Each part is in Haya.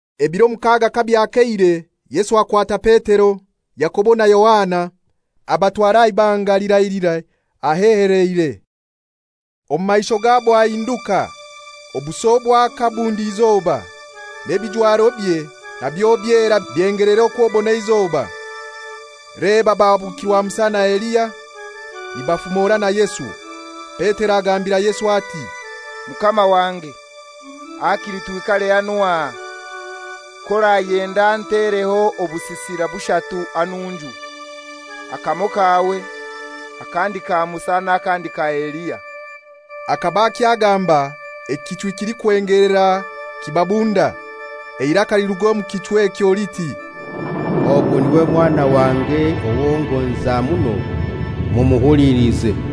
Ebiro mukaga kabyakeire Yesu akwata Petero, Yakobo na Yohana, abatwara aha ibanga lirailirai, aheheleire. Omu maisho gabo ahinduka, obuso bwaka bundi izoba, n'ebijwarobye nabyo byera byengelera okw'obona eizoba. Leba bahabukirwa Musa na Eliya, nibafumora na Yesu. Petero agambira Yesu ati, «Mukama wange, hakili twikare hanu aha. K'orayenda ntereho obusisira bushatu hanunju. Akamoi kawe, akandi ka Musa n'akandi ka Eliya.» Akaba akyagamba ekichwi kilikwengelera kibabunda, eiraka liruga omu kichwi ekyo liti, «Ogu niwe Mwana wange owo ngonza muno, mumuhulilize.»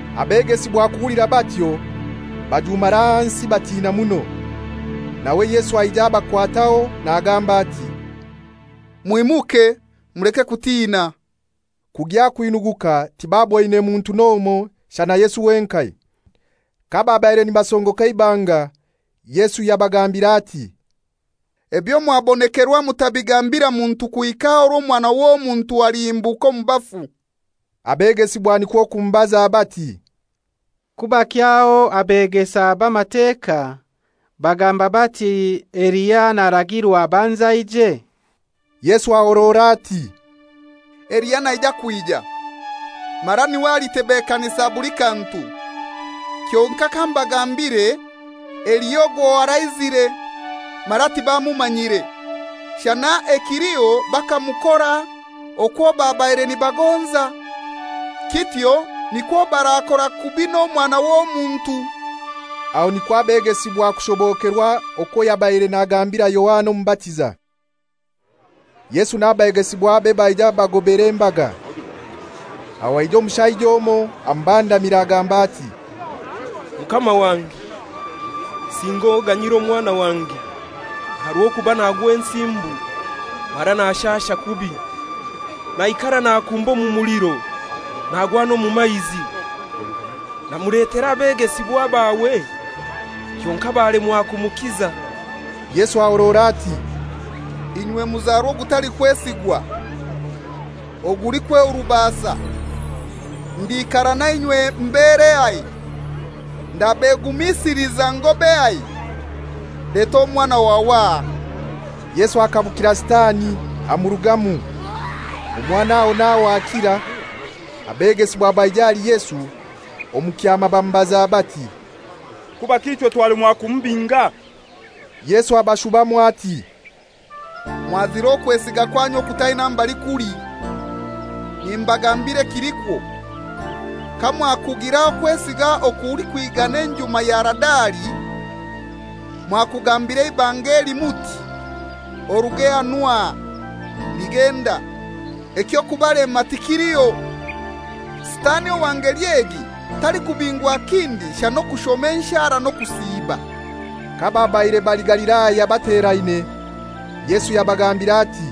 Abegesibwa kuhulira batyo, bajumara ahansi batina muno. Nawe Yesu aija abakwataho nagamba ati, «Mwimuke, muleke kutina.» Kugya kwinuguka tibaboine muntu n'omoi shana Yesu wenkai. Kababaire nibasongoka eibanga Yesu yabagambira ati, «Ebyo mwabonekerwa mutabigambira muntu kuhika orwo Omwana w'Omuntu alihimbuka omu bafu.» Abegesibwa nikwo kumubaza bati, «Kubaki aho abegesa b'Amateka bagamba bati Elia naragirwa abanze aije?» Yesu ahorora ati, «Eliya naija kwija, mara niwe alitebekanisa buli kantu. Kyonkai kambagambire Eliya ogwo araizire, mara tibamumanyire, shana ekiliho bakamukora okwo babaire nibagonza. Kityo nikwo barakora kubi n'Omwana w'Omuntu.» Aho nikwo abegesibwa kushobokerwa okwo yabaire nabagambira Yohana Omubatiza. Yesu n'abegesibwabe baija bagobera embaga. Aho aija omushaija omoi amubandamira agamba ati, «Mukama wange, singa oganyire omwana wange, aha rw'okuba nagwa ensimbu mara nashasha kubi. Naikara nakumba omu muliro nagwa n'omu maizi. Namuletera abegesibwa bawe kyonkai balemwa kumukiza.» Yesu ahorora ati, «Inywe muzarwa ogutalikwesigwa, ogulikwehurubasa, ndiikara na inywe mberehai? Ndabegumisiliza ngobehai? Leta omwana wawe aha.» Yesu akabukira Sitani amurugamu, omwana aho n'aho akira. Abegesibwa baija ahali Yesu omu kyama bamubaza bati, «Kubaki ichwe twalemwa kumubinga?» Yesu abashubamu ati, «Mwazira okwesiga kwanyu okutaina mbali kuli. Nimbagambira ekilikwo, kamwakugira okwesiga okulikwigana enjuma ya Haradali, mwakugambira eibanga eli muti, ‹Oruge hanu aha,› ligenda; eky'okubalema tikiliho. [ Sitani owa ngeli egi talikubingwa kindi shana okushoma enshara n'okusiiba.»] Kababaire bali Galilaya bateraine, Yesu yabagambira ati,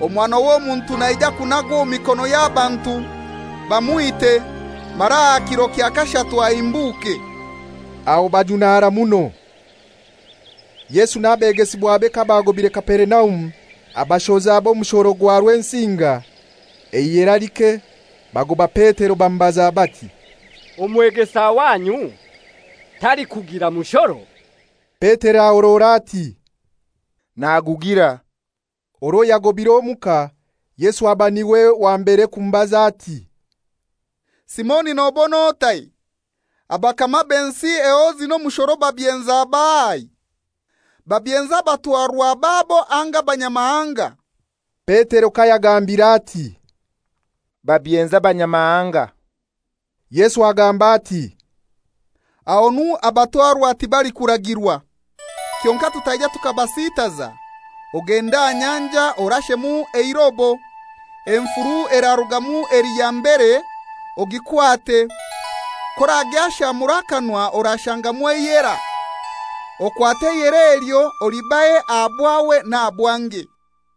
«Omwana w'Omuntu naija kunagwa omu mikono y'abantu, bamwite, mara aha kiro kya kashatu ahimbuke.» Aho bajunara muno. Yesu n'abegesibwabe kabagobire Kaperinaumu, abashoza b'omushoro gwa Rwensinga, eihera like, bagoba Petero bamubaza bati, «Omwegesa wanyu talikugira mushoro?» Petero ahorora ati, «Nagugira.» Orwo yagobire omuka Yesu aba niwe wa mbere kumubaza ati, «Simoni nobon'otai? Abakama b'ensi ehozi n'omushoro babyenza bahai? Babyenza abatwarwa babo anga abanyamahanga?» Petero kayagambiire ati, «Babyenza abanyamahanga,» Yesu agamba ati, «Ahonu abatwarwa tibalikuragirwa. Kyonkai tutaija tukabasiitaza, ogende aha nyanja orashemu eirobo, enfuru erarugamu eli ya mbere ogikwate, k'oragyashamura akanwa orashangamu eihera. Okwate eihera elyo olibahe aha bwawe n'aha bwange.»